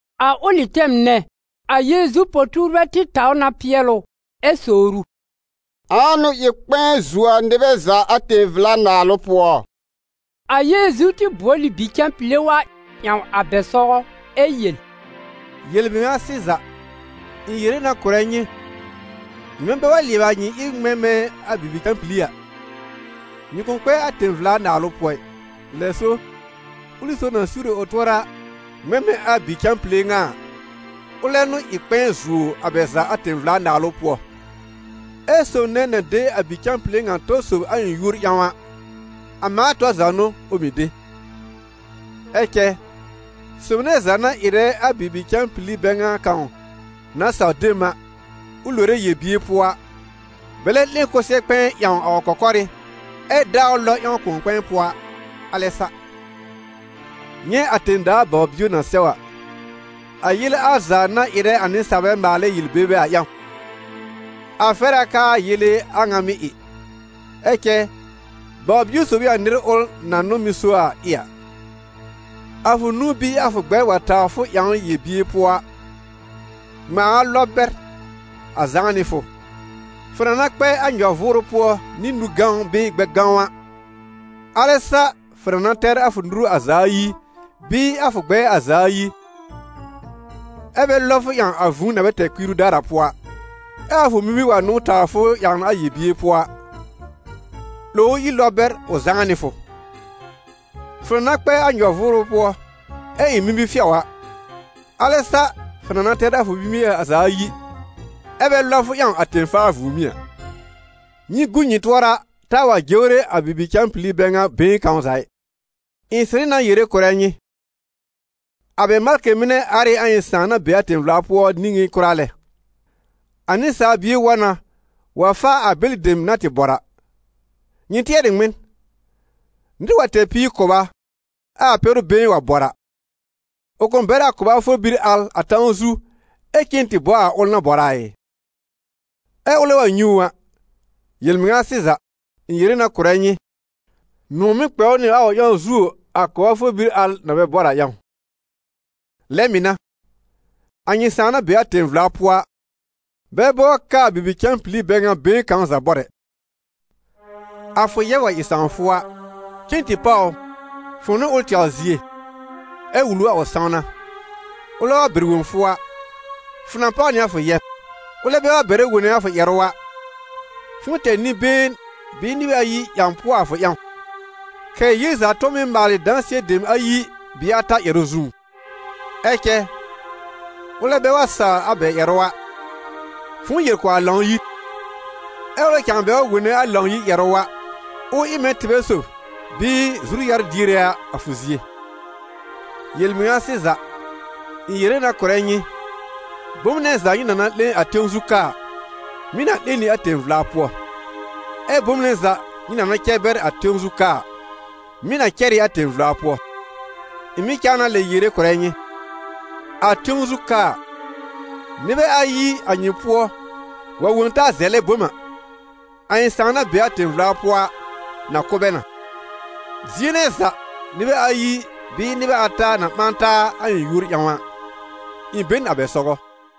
A ʋlɩ tɛm nɛ, a Yeezu po-tuurbɛ tɩ taw na pɩɛl ʋ, ɛ sowr ʋ: «Ãa n'ʋ ɩ kpɛ̃ɛ zuo a nɩbɛ za a tẽ-vla-naalʋ pʋɔ?» A Yeezu tɩ bʋɔl ɩ bi-cãpile wa ƴãw a bɛ sɔgɔ, ɛ yel: «Yel-mɩŋa sɩza, ɩ̃ yere na kʋ̀rɛ nyɩ, nyɩmɛ bɛ wa lɩɛbɩ a nyɩ ɩb ŋmɛ̃ mɛ̃ a bibi-cãpili a, nyɩ kʋ̃ kpɛ a tẽ-vla-Naalʋ pʋɔ ɩ. Lɛ so, ʋlɩ sob na siwre ʋ tʋɔra ŋmɛ̃ mɛ̃ a bi-cãpile ŋa a, ʋlɛ n'ʋ ɩ kpɛ̃ɛ zuo a bɛ za a tẽ-vla-Naalʋ pʋɔ. Ɛ sob nɛ na de a bi-cãpile ŋa tɔ sob a ɩ̃ yúor ƴãw a, a mãa tɔr za n'ʋ ʋ mɩ̀ de.» «Ɛ cɛ sob nɛ za na ɩrɛ a bibi-cãpili bɛ ŋa kãw na saw de m a, ʋ lore yel-bier pʋɔ a, bɛlɛ 'lẽ kʋsɛ-kpɛ̃ɛ ƴãw a ʋ kɔkɔrɩ́, ɛ daa ʋ lɔb ƴãw kʋ̃ɔ-kpɛ̃ɛ pʋɔ a, alɛ sa. Nyɛ̃ a tẽ-daa baw-bio na sɛw a, a yele al za na ɩrɛ a nɩsaalbɛ maalɛ yel-bebe a ƴãw! A fɛr a k'aa yele a ŋa mɩ́ ɩ, ɛ cɛ baw-bio sob ɩ a nɩr ʋl na n'ʋ mɩ́ so a ɩ a. A fʋ nũu bɩɩ a fʋ gbɛr wa tawr fʋ ƴãwn yel-bier pʋɔ a, ŋmãa a lɔb bɛr a zãá nɩ fʋ; fʋ na na kpɛ a nyɔ-vʋʋrʋ pʋɔ nɩ nũ-gãw bɩɩ gbɛ-gãw a, alɛ sa fʋ na na tɛr a fʋ nuru a za ayi bɩɩ a fʋ gbɛɛ a za ayi, ɛ́ bɛ lɔb fʋ ƴãw a vũu na bɛ tɛr kpiiru daar a pʋɔ a. Ɛ a fʋ mimir wa n'ʋ tawr fʋ ƴãwn a yel-bier pʋɔ a, 'lòw ʋ ír lɔb bɛr ʋ zãá nɩ fʋ. Fʋ na na kpɛ a nyɔ-vʋʋrʋ pʋɔ ɛ ɩ mimi-fɩɔ a, alɛ sa fʋ na na tɛr a fʋ mimie a za ayi, ɛ́ bɛ lɔb fʋ ƴãw a tẽ-faa vũùmí a.» «Nyɩ gu nyɩ tʋɔra taa wa jewre a bibi-cãpili bɛ ŋa been kãw za ɩ; ɩ̃ sɩrɩ na yere kʋ̀rɛ nyɩ, a bɛ malkɩ mɩnɛ ar ɩ a ɩ̃ Sãà na be a tẽ-vla pʋɔ niŋé kʋra lɛ. [ A Nɩsaal Bie wa na wa faa a bɛlɩ dem na tɩ bɔr a.] Nyɩ tɩɛr ɩ ŋmɩn? Nɩr wa tɛr píir kʋba, ɛ a pɛ́rʋ been wa bɔr a, ʋ kʋ̃ bɛr a kʋba for bir al a tãw zu ɛ cen tɩ bɔ a ʋl na bɔr a ɩ? Ɛ ʋlɛ wa nyɛ̃ ʋ a, yel-mɩŋa sɩza, ɩ̃ yere na kʋ̀rɛ nyɩ, nʋ̃ɔ̀ mɩ́ kpɛ ʋ nɩ a ʋ ƴãw zuo a kʋba for bir al na bɛ bɔr a ƴãw. Lɛ mɩ̀ n'a, a nyɩ Sãà na be a tẽ-vla pʋɔ a, bɛ bɔr k'aa bibi-cãpili bɛ ŋa been kãw za bɔr ɛ.» «A fʋ yɛb wa ɩ sãw fʋ a, cen tɩ páw ʋ, fʋ̃ʋ nɩ ʋl tɛwr zie, ɛ wul ʋ a ʋ sãwna. Ʋlɛ wa bɛr wõ fʋ a, fʋ na páw nɩ a fʋ yɛb. Ʋlɛ bɛ wa bɛrɛ wone a fʋ ƴɛrʋ a, fʋ̃ʋ tɛr nɩ-been bɩɩ nɩbɛ ayi ƴãw pʋɔ a fʋ ƴãw, kɛ̀ ‹Yel za tʋ̃ɔ mɩ́ maalɩ dãsɩɛ dem ayi bɩɩ ata ƴɛrʋ zũú.› Ɛ cɛ ʋlɛ bɛ wa sawr a bɛ ƴɛrʋ a, fʋ̃ʋ yel kʋ̀ a Lãw-yir. Ɛ ʋlɛ cãa bɛ wa wone a Lãw-yir ƴɛrʋ a, ʋ ɩ mɛ̃ tɩbɛ sob bɩɩ zuru-yar-diere a a fʋ zie.» «Yel-mɩŋa sɩza, ɩ̃ yere na kʋ̀rɛ nyɩ, bom nɛ za nyɩ na na 'lẽ a tẽw zu ka a, mɩ̀ na 'lẽ nɩ a tẽ-vla pʋɔ, ɛ bom nɛ za nyɩ na na cɛr bɛr a tẽw zu ka a, mɩ̀ na cɛr ɩ a tẽ-vla pʋɔ.» «Ɩ̃ mɩ̀ cãa na lɛ yere kʋ̀rɛ nyɩ, a tẽw zu ka a, nɩbɛ ayi a nyɩ pʋɔ wa wõ taa zɛlɛ bom a, a ɩ̃ Sãà na be a tẽ-vla pʋɔ a, na kʋ̀ bɛ na. Zie nɛ za nɩbɛ ayi bɩɩ nɩbɛ ata na ɓã taa a ɩ̃ yúor ƴãw a, ɩ̃ be n a bɛ sɔgɔ.»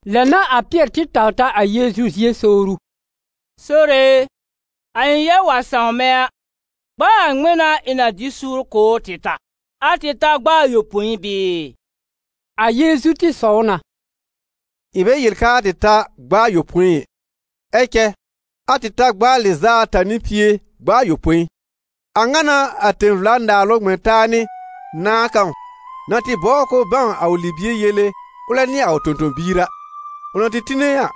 Lɛ n'a a Pɩɛr tɩ taw ta a Yeezu zie sowr ʋ: «Sore e, a ɩ̃ yɛb wa sãw mɛ̃ a, gb'a a ŋmɩn n'a ɩ̃ na dɩ suur kʋ̀ ʋ tɩ ta? A tɩ ta gb'a ayopõi bɩɩ?» A Yeezu tɩ sɔw na: «Ɩ̃ bɛ yel k'aa tɩ ta gb'a ayopõi ɛ, ɛ cɛ a tɩ ta gb'a a lɩz'a ata nɩ pie gb'a ayopõi. A ŋa n'a a tẽ-vla-Naalʋ ŋmɛ̃ taa nɩ nãà kãw na tɩ bɔbr k'ʋʋ bãw a ʋ libie yele ʋlɛ nɩ a ʋ tõ-tõ-biir a. Ʋ na tɩ tine a,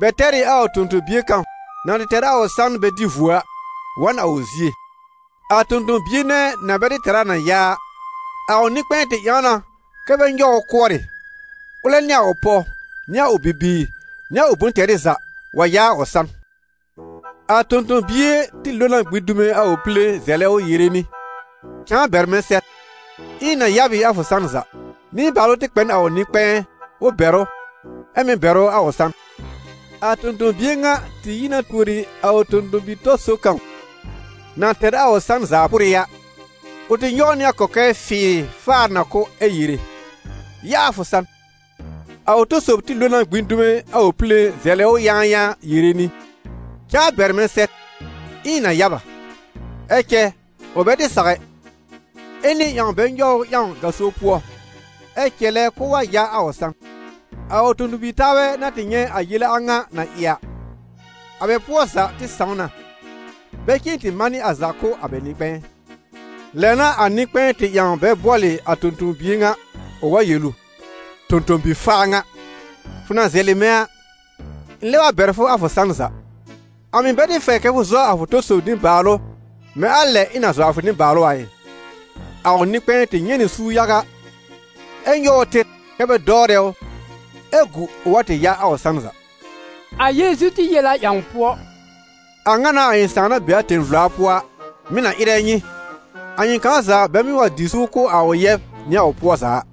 bɛ tɛr ɩ a tõ-tõ-bie kãw na tɩ tɛr a ʋ san bɛ dɩ vuo a, wa n a ʋ zie. A tõ-tõ-bie nɛ na bɛ tɩ tɛr a na ya a, a ʋ nɩ-kpɛ̃ɛ tɩ ƴãw na kɛ́ bɛ nyɔw ʋ kʋɔrɩ, ʋlɛ nɩ a ʋ pɔw nɩ a ʋ bibiir, nɩ a ʋ bʋ̃-tɛrɩ za, wa ya a ʋ san. A tõ-tõ-bie tɩ lo na gbĩ dume a ʋ pile zɛlɛ ʋ yere nɩ: ‹Cãa bɛr mɛ̃ sɛr, ɩ̃ na ya b ɩ a fʋ san za.› Nɩbaalʋ tɩ kpɛ n a ʋ nɩ-kpɛ̃ɛ, ʋ bɛr ʋ, ɛ mɩ̀ bɛr ʋ a ʋ san. A tõ-tõ-bie ŋa tɩ yi na tuori a ʋ tõ-tõ-bi-tɔ sob kãw na tɛr a ʋ san zaa pʋrɩ a. Ʋ tɩ nyɔw ʋ nɩ a kɔkɛɛ fɩɩrɩ faar na kʋ́ ɛ yere: ‹Ya a fʋ san!› A ʋ tɔ sob tɩ lo na gbĩ dume a ʋ pile zɛlɛ ʋ yãayãa yere nɩ: ‹Cãa bɛr mɛ̃ sɛr, ɩ̃ɩ na ya b a.› Ɛ cɛ ʋ bɛ tɩ saw ɛ, ɛ nɩ̃ɛ tɩ ƴãw bɛ nyɔw ʋ ƴãw gaso pʋɔ, ɛ cɛlɛ k'ʋʋ wa ya a ʋ san. A ʋ tõ-tõ-bi-taabɛ na tɩ nyɛ̃ a yele a ŋa na ɩ a, a bɛ pʋɔ za tɩ sãw na, bɛ cen tɩ manɩ a za kʋ̀ a bɛ nɩ-kpɛ̃ɛ. Lɛ n'a a nɩ-kpɛ̃ɛ tɩ ƴãw bɛ bʋɔlɩ a tõ-tõ-bie ŋa, ʋ wa yel ʋ: ‹Tõ-tõ-bi-faa ŋa! Fʋ na zɛlɩ mɛ̃ a, ɩ̃ lɛb a bɛr fʋ a fʋ san za. A mɩ̀ bɛ tɩ fɛr kɛ fʋ zɔ a fʋ tɔ sob nɩbaalʋ mɛ̃ a lɛ ɩ̃ na zɔ a fʋ nɩbaalʋ a ɩ?› A ʋ nɩ-kpɛ̃ɛ tɩ nyɛ̃ nɩ suur yaga, ɛ nyɔw ʋ tɩr kɛ́ bɛ dɔwrɛ ʋ, ɛ gu ʋ wa tɩ ya a ʋ san za.» A Yeezu tɩ yel a ƴãw pʋɔ: «A ŋa n'a a ɩ̃ Sãà na be a tẽ-vla pʋɔ a, mɩ̀ na ɩrɛ nyɩ, a nyɩ kãw za bɛ mɩ̀ wa dɩ suur kʋ̀ a ʋ yɛb nɩ a ʋ pʋɔ za a.»